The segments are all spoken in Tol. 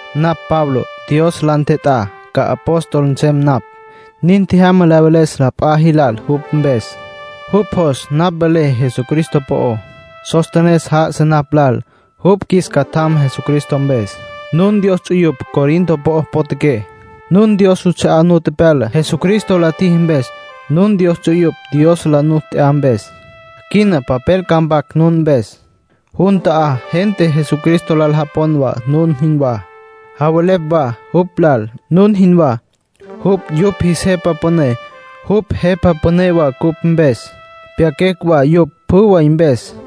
Napj Pablo. Dios la ntjet'á ca apóstol nsem napj. Nin tjejyama la veles la p'a jilal jupj mpes. Jupj jos napj velé Jesucristo po'ó. Sóstenes já'asa napj lal. Jupj qjuis catjam Jesucristo mpes. Nun Dios ts'uyupj Corinto po'o potjaqué. Nun Dios juts'a'á nu tepyala, Jesucristo la tjiji mpes. Nun Dios ts'uyupj, Dios la nu t'ya mpes. Quina papel ca mpaquecj nun mpes. Jun ta'á gente Jesucristo lal japon wa, nun jinwá. Javelepj wa jupj lal, nun jinwá. Jupj yupj jis Jepa Püné. Jupj Jepa Püné wa cupj mpes. Pyaquecj wa yupj pjü way mpes.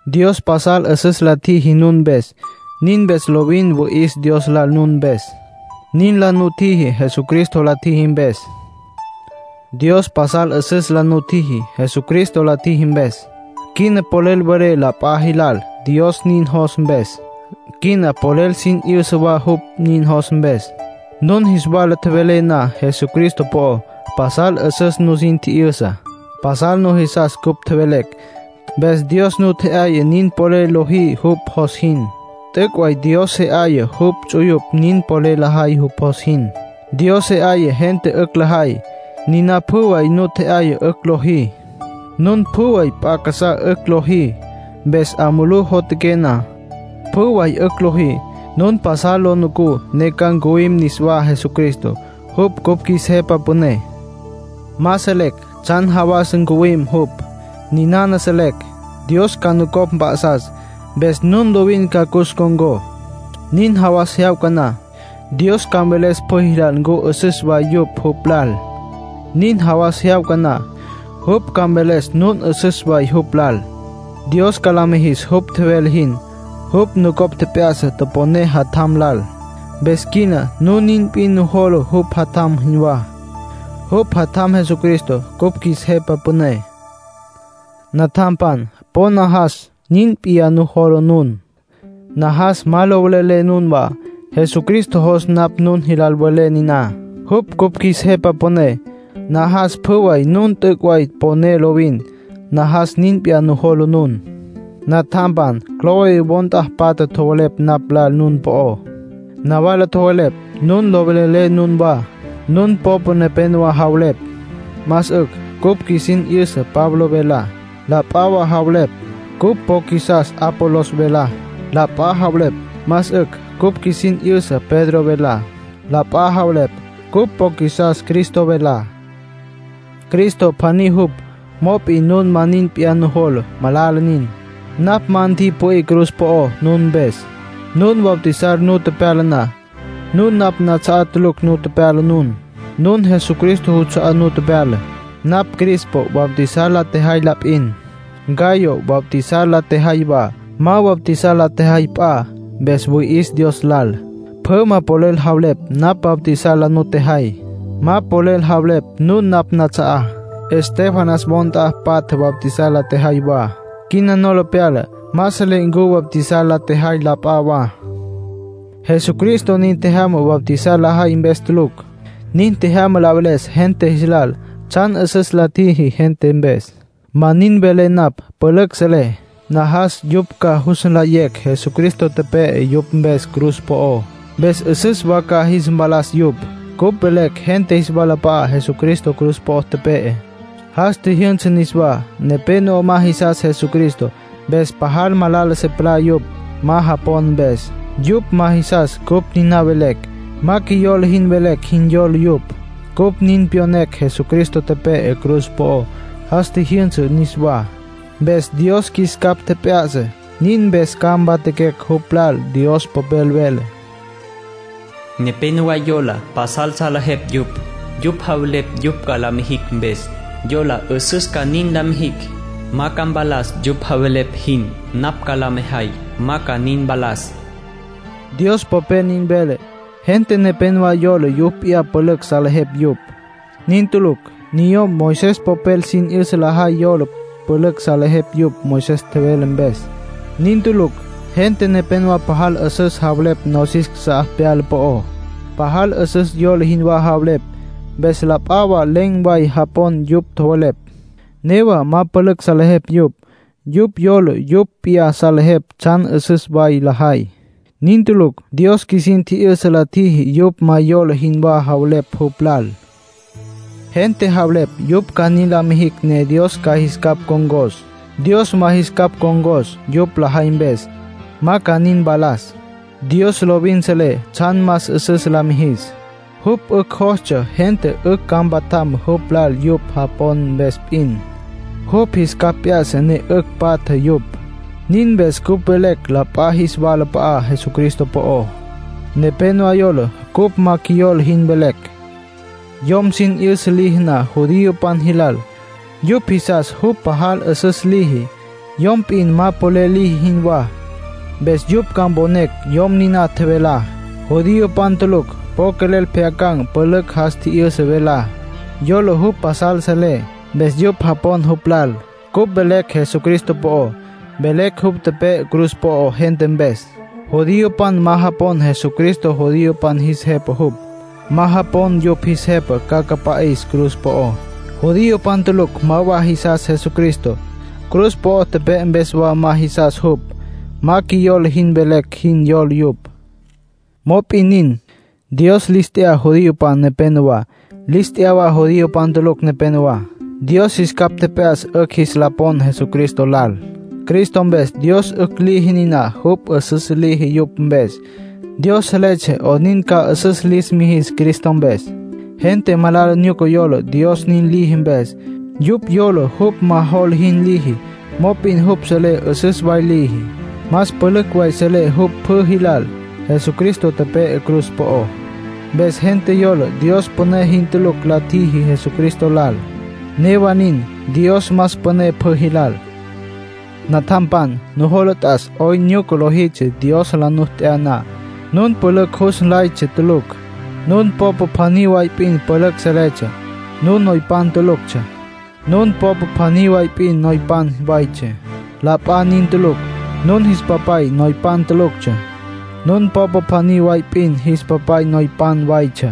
Dios pasal 'üsüs la tjiji nun mpes; nin mpes lovin wüi'is Dios lal nun mpes. Nin la nutjiji Jesucristo la tjiji mpes. Dios pasal 'üsüs la nutjiji, Jesucristo la tjiji mpes. Quina polel welé la p'a jilal Dios nin jos mpes. Quina polel sin 'yüsa wa jupj nin jos mpes. Nun jis wala tjevelecj na Jesucristo po'ó, pasal 'üsüs nusin tji'yüsa. Pasal nujisas cupj tjevelecj. Mpes Dios nu tje'yaya nin polel lojí jupj jos jin. T'üc' way Dios se 'aya jupj ts'uyupj nin polel lajay jupj jos jin. Dios se 'aya gente 'ücj lajay, niná pjü way nu tje'yaya 'ücj lojí. Nun pjü way p'a casá 'ücj lojí, mpes 'a mulú jotjaqué na, pjü way 'ücj lojí. Nun pasal lu nucú ne ca ncuwim niswá Jesucristo. Jupj cupj qjuis Jepa Püné. Ma selecj tsjan jawas ncuwim jupj. Ninana selecj: Dios ca nucopj mp'a'sas, mpes nun lovin ca cus ncon̈có. Nin jawas jyawca na, Dios ca mveles pjü jilal ncu 'üsüs way yupj jupj lal. Nin jawas jyawca na, jupj ca mveles nun 'üsüs way jupj lal. Dios ca la mijis jupj tjevele jin. Jupj nucopj tjep'ya'sa toponé Jatjam lal, mpes quina nun nin p'in nujola jupj Jatjam jinwá. Jupj Jatjam Jesucristo cupj qjuis Jepa Püné. Natjampan, po najas nin p'iyá nujola nun. Najas ma lo velelé nunwá. Jesucristo jos napj nun jilal velé niná, jupj cupj qjuis Jepa Püné. Najas pjü way nun t'üc' way poné lovin. Najas nin p'iyá nujola nun. Natjampan, Cloé wo nt'a patja tjowelepj napj lal nun po'ó. Nawala tjowelepj nun lo velelé nunwá. Nun popa nepénowa javelepj: “Más 'ücj cupj qjuisin 'yüsa Pablo velá”. La p'a wa javelepj: “Cupj po qjuisas Apolos velá”. La p'a javelepj: “Más 'ücj cupj qjuisin 'yüsa Pedro velá”. La p'a javelepj: “Cupj po qjuisas Cristo velá”. Cristo pjaní jupj. Mop'in nun ma nin p'iyá nujola. Malala nin. Napj ma ntipü'í cruz po'ó nun mpes. Nun bautizar nu tepyala na, nun napj nats'a'á tulucj nu tepyala nun. Nun Jesucristo juts'a'á nu tepyala. Napj Crispo bautizar la tjejay la p'in; Gayo bautizar la tjejay wa. Ma bautizar la tjejay p'a. Mpes wüi'is Dios lal. Pjü ma polel javelepj napj bautizar la nutjejay. Ma polel javelepj nun napj nats'a'á. Estéfanas wo nt'a patja bautizar la tjejay wa; quina nola tepyala. Ma selé ncu bautizar la tjejay la p'a wa. Jesucristo nin tjejyama bautizar lejay mpes tulucj. Nin tjejyama la veles gente jis lal tsjan 'üsüs la tjiji gente mpes. Ma nin velé napj pülücj selé. Najas yupj ca jus nlayecj Jesucristo tepe'e yupj mpes cruz po'ó, mpes 'üsüs wa ca jis mpalas yupj. Cupj velecj gente jis walap'a'á Jesucristo cruz po'o tepe'e, jas tjijyünsa niswá. Nepénowa ma jisas Jesucristo, mpes pajal malala se palá yupj, ma japon mpes. Yupj ma jisas cupj niná velecj. Ma qjuiyola jin velecj jin yola yupj. Cupj nin pyonecj Jesucristo tepe'e cruz po'ó, jas tjijyünsa niswá. Mpes Dios qjuis capj tjep'ya'sa, nin mpes ca mpatjaquecj jupj lal. Dios Popel vele: “Nepénowa yola pasal salejepj yupj. Yupj javelepj yupj ca la mijicj mpes; yola 'üsüs ca nin la mijicj. Ma ca mpalas yupj javelepj jin, napj ca la mejay ma ca nin mpalas.” Dios Popel nin vele. Gente nepénowa yola yupj p'iyá pülücj salejepj yupj. Nin tulucj. Niyom Moisés popel sin 'yüsa lajay yola pülücj salejepj yupj Moisés tjevele mpes. Nin tulucj. Gente nepénowa pajal 'üsüs javelepj nosis casá pyala po'ó. Pajal 'üsüs yola jinwá javelepj, mpes la p'a wa len̈ way japon yupj tjowelepj. Newa ma pülücj salejepj yupj. Yupj yola yupj p'iyá salejepj tsjan 'üsüs way lajay. Nin tulucj. Dios qjuisin tji'yüsa la tjiji yupj ma yola jinwá javelepj jupj lal. Gente javelepj yupj ca nin la mijicj ne Dios ca jis capj ncon̈cos. Dios ma jis capj ncon̈cos yupj lajay mpes. Ma ca nin mpalas. Dios lovin selé tsjan más 'üsüs la mijis. Jupj 'ücj jostsja gente 'ücj ca mpatjam jupj lal yupj japon mpes p'in. Jupj jis capj p'ya'sa ne 'ücj patja yupj. Nin mpes cupj velecj la p'a jis walap'a'á Jesucristo po'ó. Nepénowa yola cupj ma qjuiyola jin velecj. Yom sin 'yüsa liji na judiopan jilal, yupj jisas jupj pajal 'üsüs liji, yom p'in ma polel liji jinwá. Mpes yupj ca mponecj yom niná tjevelá. Judiopan tulucj po quelel pjyacan̈ pülücj jas tji'yüsa velá. Yola jupj pasal selé, mpes yupj japon jupj lal. Cupj velecj Jesucristo po'ó. Velecj jupj tepe'e cruz po'ó gente mpes. Judiopan ma japon Jesucristo judiopan jis jepa jupj. Ma japon yupj jis jepa ca cüpa'is cruz po'ó. Judiopan tulucj ma wa jisas Jesucristo. Cruz po'o tepe'e mpes wa ma jisas jupj. Ma qjuiyola jin velecj jin yola yupj. Mop'in nin, Dios lis t'ya judiopan nepenowá, lis t'ya wa judío tulucj nepenowá. Dios jis capj tjep'ya'sa 'ücj jis la pon Jesucristo lal. Cristo mpes Dios 'ücj liji niná jupj 'üsüs liji yupj mpes. Dios seletsja 'onin ca 'üsüs lis mijis Cristo mpes. Gente malala nyuca yola Dios nin liji mpes. Yupj yola jupj ma jola jin liji. Mop'in jupj selé 'üsüs way liji. Más pülücj way selé jupj pjü jilal. Jesucristo tepe'e cruz po'ó. Mpes gente yola Dios püné jin tulucj la tjiji Jesucristo lal. Newa nin, Dios más püné pjü jilal. Natjampan, nujola t'as 'oyn nyuca lojitsja Dios la nu t'ya na. Nun pülücj jus nlaytsja tulucj. Nun popa pjaní way p'in pülücj salejeptsja. Nun noypan tuluctsja. Nun popa pjaní way p'in noypan waytsja, la p'a nin tulucj. Nun jis papay noypan tuluctsja. Nun popa pjaní way p'in jis papay noypan waytsja,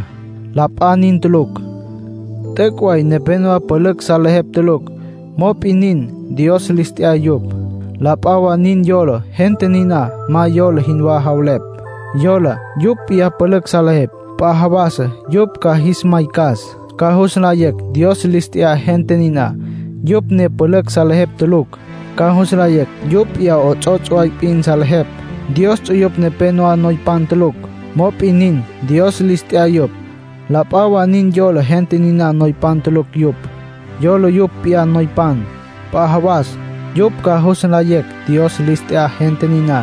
la p'a nin tulucj. T'üc' way nepénowa pülücj salejepj tulucj. Mop'in nin, Dios lis t'ya yupj. La p'a wa nin yola gente niná ma yola jinwá javelepj. Yola yupj p'iyá pülücj salejepj. P'a jawasa yupj ca jis maycas; ca jus nlayecj Dios lis t'ya gente niná, yupj ne pülücj salejepj tulucj. Ca jus nlayecj yupj p'iyá 'ots'ots' way p'in salejepj. Dios ts'uyupj nepénowa noypan tulucj. Mop'in nin, Dios lis t'ya yupj. La p'a wa nin yola gente niná noypan tulucj yupj. Yola yupj p'iyá noypan. P'a jawas yupj ca jus nlayecj Dios lis t'ya gente niná,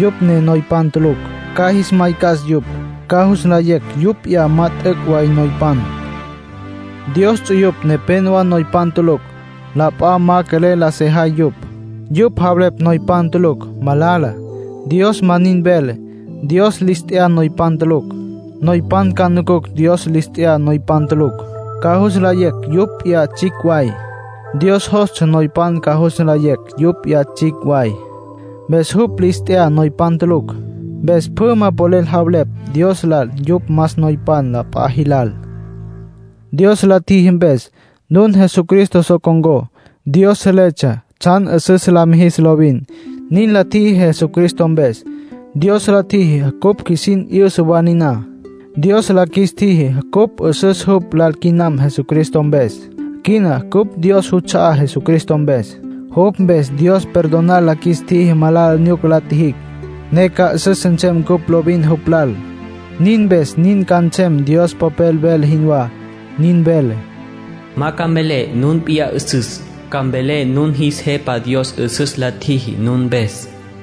yupj ne noypan tulucj. Ca jis maycas yupj; ca jus nlayecj yupj p'iyá ma t'üc' way noypan. Dios ts'uyupj nepénowa noypan tulucj. La p'a ma quelel la sajay yupj. Yupj javelepj noypan tulucj malala. Dios ma nin vele. Dios lis t'ya noypan tulucj. Noypan ca nucucj Dios lis t'ya noypan tulucj. Ca jus nlayecj yupj p'iyá tsjicj way. Dios jostsja noypan ca jus nlayecj yupj p'iyá tsjicj way, mpes jupj lis t'ya noypan tulucj. Mpes pjü ma polel javelepj Dios lal yupj más noypan la p'a jilal. Dios la tjiji mpes, nun Jesucristo so con̈có. Dios seletsja tsjan 'üsüs la mijis lovin. Nin la tjiji Jesucristo mpes. Dios la tjiji cupj qjuisin 'yüsa wa niná. Dios la qjuis tjiji cupj 'üsüs jupj lal quinam Jesucristo mpes. Quina cupj Dios juts'a'á Jesucristo mpes. Jupj mpes Dios perdonar la qjuis tjiji malala nyuca la tjijicj, ne ca 'üsüs nsem cupj lovin jupj lal. Nin mpes nin ca nsem Dios Popel vele jinwá. Nin vele: “Ma ca mvelé nun p'iyá 'üsüs; ca mvelé nun jis Jepa Dios 'üsüs la tjiji nun mpes”.